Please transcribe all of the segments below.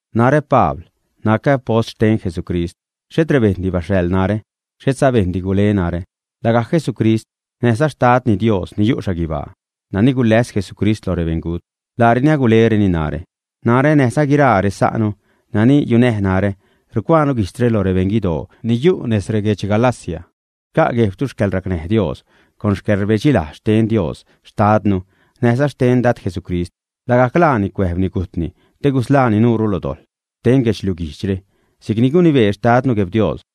Narä, Pabl, nacä apost xten Jesucrist. Xhet rebejṉdi baxhaḻ narä, xhetza bejṉdi gule narä. Lagajc Jesucrist näjza Xtadni Dios ni yu' xhaguibaa, nani guläs Jesucrist loj rebeṉgut, laareni agulereni narä. Narä, näjza guiraa resa'nu nani yunäj narä, rucuaanu guijtzre lo rebeṉ guidoo ni yu' nez reguedx Galacia. Xca' guejbtu xcäḻracnäj Dios con xcäḻrbedxilajz xten Dios xtadnu näjza xten Dad Jesucrist. Lagajc laani cuäjbni gujtni te gusḻaani nuure lo dojḻ xten guedxliuj guijdxre, si'cni gunibee Xtadnu, Gueb-Dios.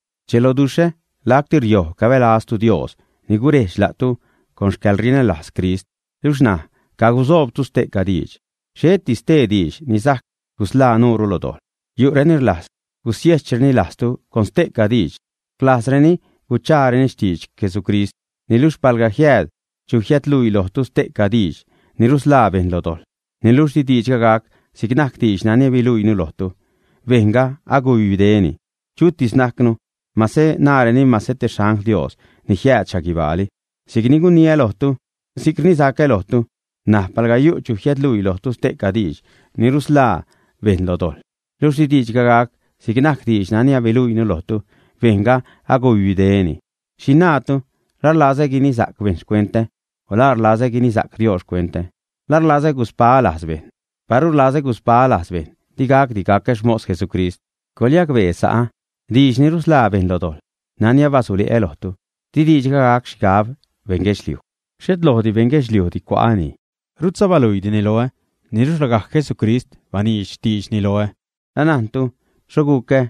Rdxeloduxhä lacti riojb cabälaztu Dios ni gurejdx la'tu con xcäḻrinälajz Crist, luxh ṉaj cagusoobtu ste'ca diidx. Xhetdi stee diidx ni sajc gusḻaa nuure lo dojḻ. Yu'reni rlajz gusiejchreni lajztu con ste'ca diidx, rlajzreni guchaareni xtidx Jesucrist. Niluxh palga jiääd chu jiädluii lojtu ste'ca diidx ni rusḻaa bejṉ lo dojḻ, niluxh di diidxga gac si'c najc diidx nani abaluiinu lojtu, bejṉga agubibdeni, chutis najcnu, mase naräni, mase te xangl Dios ni jiääd xhaguibaali. Si'c ni guniä lojtu, si'c rnisacä lojtu ṉaj: Pal yu' chu jiädluii lojtu ste'ca diidx ni rusḻaa bejṉ lo dojḻ, luxh di diidxga gac si'c najc diidx nani abaluiinu lojtu, bejṉga agubibdeni. ¿Xhi naatu? ¿La rlazä guinisa'c bejṉ xcuentä o la rlazä guinisa'c Dios xcuentä, ä? ¿La rlazä guspaä lajz bejṉ, ä? Paru rlazä guspaä lajz bejṉ, digacdi gacä xmos Jesucrist. Coḻyacbee sa'ä, diidx ni rusḻaa bejṉ lo dojḻ nani abasule'ä lojtu di diidxga gac xhigab beṉ guedxliuj. Xhet lojdi beṉ guedxliujdi cua'äni, rutza baluiidini loä, niluxh lagajc Jesucrist baniidx xtiidxni loä. Anajntu xho gucä,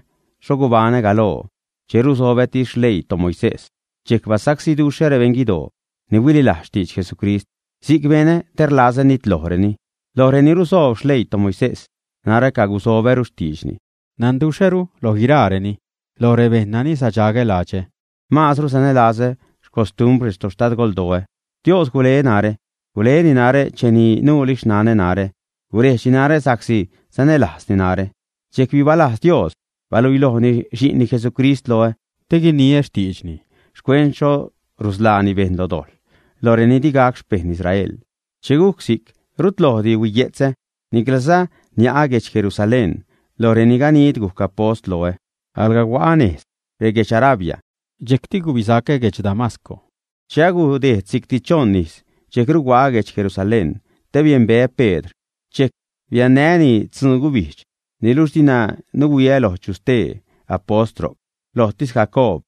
xho gubaṉä galoo che rusobätis rexleii toMoisés. Dxejc basacsíduxhä rebeṉ guidoo ni huililajz xtidx Jesucrist, si'c benä te rlazä nitlojreni. Loj reni rusoob xleii toMoisés narä cagusobäru xtiidxni, nanduxhäru loj guiraareni. Loj rebejṉ nani sadxagä ladxä, maazru sanälazä xcostumbr retoxtadgoldoä. Dios gule narä, guleni narä cheni nuuli xnanä narä, gurejdxni narä sa'csi sanälajzni narä. Dxejc bibalajz Dios baluilojni Xi'nni Jesucrist loä te guiniä xtiidxni xcuent xho rusḻaani bejṉ lo dojḻ loj reni di gac xpejṉ Israel. Che gujc si'c rut lojdi huiye'tzä. Niclaza nia'ä guedx Jerusalén loj reni ganid gujc apost loä. Alga hua'a nez reguedx Arabia, dxejcti gubisacä guedx Damasco. Che agudejd si'cti choṉ ijz, dxejcru hua'a guedx Jerusalén te biembeä Pedr, dxejc biannää́ni tzun-gubijdx. Niluxh dina nuhuiä loj chu stee apost ro'c. Lojtis Jacoob,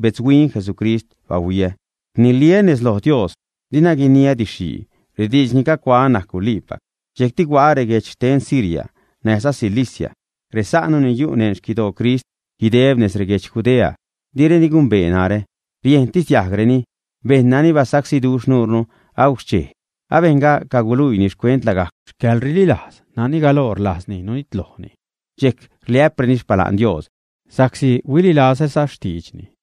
betzhuin Jesucrist bahuiä. Rniliä́ nez lo Dios, dina guiniä didx-xhii, rediidx ni cacuaä najc guliipac. Dxejcti hua'a reguejdx xten Siria näjza Cilicia. Resa'nu ni yu' neṉ xquidoo Crist guideb nez reguedx Judea, direni gumbee narä. Riejntis diajgreni: “Bejṉ nani basacsíduxh nuure agujc xchej, abejṉga caguluiini xcuent lagajc xcäḻrililajz nani galoo rlajzni nunitlojni.” Dxejc rliä'preni xpala'n Dios sa'csi huililazäza xtiidxni.